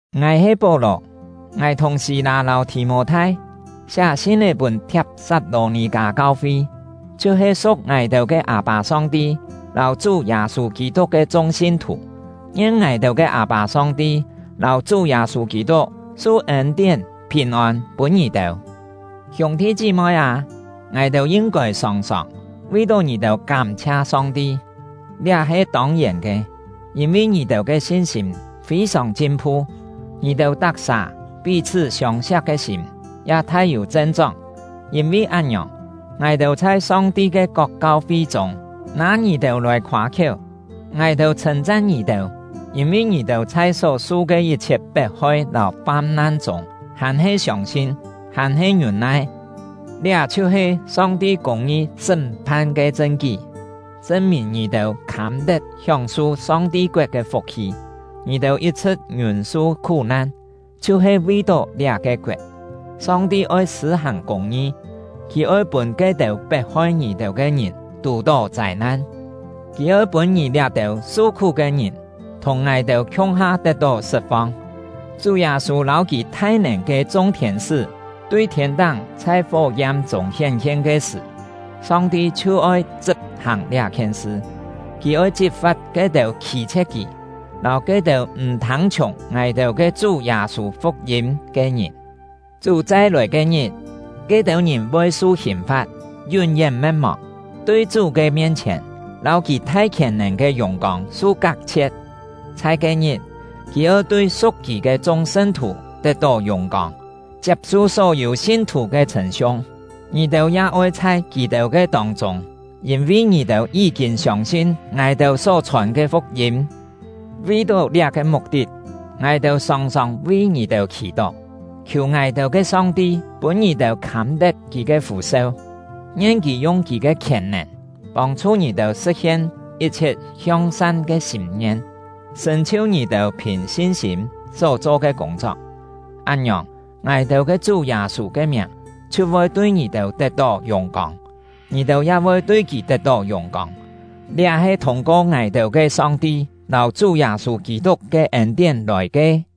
Ngài he Pó-lò; ngài thùng Sî-lâ lâu Thì-mô-thai siá sin-é pûn Thiap-sat-lò-nì-kâ kau-fi, chhiu-he su̍k ngài-têu ke Â-pâ Song-ti lâu Chú Yâ-sû Kî-tuk ke chung sin-thù. Ngien ngài-têu ke Â-pâ Song-ti lâu Chú Yâ-sû Kî-tuk su ên-tién, phìn-ôn pûn ngì-têu! Hiûng-thi chí-moi â, ngài-têu yin-kôi sòng-sòng vi ngì-têu kám-chhia Song-ti. Liá he tông-yèn ke; yîn-vi ngì-têu ke sin-sîm fî-sòng chin-phu, ngì-têu tak-sà pí-chhṳ́ siông-siak ke sîm ya thai-yû chen-chóng. Yîn-vi án-ngiòng, ngài-têu chhai Song-ti ke kok kau-fi chûng nâ ngì-têu lòi khoâ-khiéu. Ngài-têu chhṳ̂n-chan ngì-têu, yîn-vi ngì-têu chhai só-su ke yit-chhiet pet-hoi lâu fam-nan chûng, hàn-he siông-sin, hàn-he ngiûn-nai. Liá chhiu-he Song-ti kûng-ngi sṳ́m-phan ke chṳn-kí, chṳn-mìn ngì-têu khâm-tet hióng-su Song-ti koet ke fuk-hi. Ngì-têu yit-chhṳ̍t ngiûn-su khú-nan, chhiu-he vi-tó liá-ke koet. Song-ti oi sṳ̂-hàng kûng-ngi: Kì oi pûn ke-têu pet-hoi ngì-têu ke ngìn tù-tó châi-nan; Kì oi pûn ngì liá-têu su-khú ke ngìn thùng ngài-têu khiung-ha tet-tó sṳt-fong. Chú Yâ-sû lâu kì thai-nèn ke chung thiên-sṳ́ tui thiên-táng chhai fó-yam-chûng hién-hien ke sṳ̀, Song-ti chhiu oi chṳp-hàng liá-khien sṳ. Kì oi chit-fa̍t ke-têu khî-chhie̍t Kì, lâu ke-têu m̀ thâng-chhiùng ngài-têu ke Chú Yâ-sû fuk-yîm ke ngìn. Chú chai-lòi ke-ngit, ke-têu ngìn voi su hìn-fa̍t, yún-yén me̍t-mòng, tui Chú ke mien-chhièn lâu kì thai khièn-nèn ke yùng-kông su kak-chhie̍t. Chhai ke-ngit, kì oi tui su̍k kì ke chung sṳn-thù tet-tó yùng-kông, chiap-su só-yû sin-thù ke chhṳ̂n-siung. Ngì-têu ya oi chhai kì-têu ke tông-chûng, yîn-vi ngì-têu yí-kîn siông-sin ngài-têu só-chhòn ke fuk-yîm. Vi-tó liá-ke muk-tit, ngài-têu sòng-sòng vi ngì-têu khì-tó, khiù ngài-têu ke Song-ti pûn ngì-têu khâm-tet Kì ke fû-seu. Ngien Kì yung Kì ke khièn-nèn, pông-chhu ngì-têu sṳ̍t-hien yit-chhiet hiong-san ke sîm-ngien, sṳ̀n-chhiu ngì-têu phìn sin-sîm só cho ke kûng-chok. Án-ngiòng, ngài-têu Chú Yâ-sû ke miàng chhiu voi tui ngì-têu tet-tó yùng-kông, ngì-têu ya voi tui kì tet-tó yùng-kông; liá he thûng-ko ngài-têu ke Song-ti lâu Chú Yâ-sû Kî-tuk ke ên-tién lòi ke.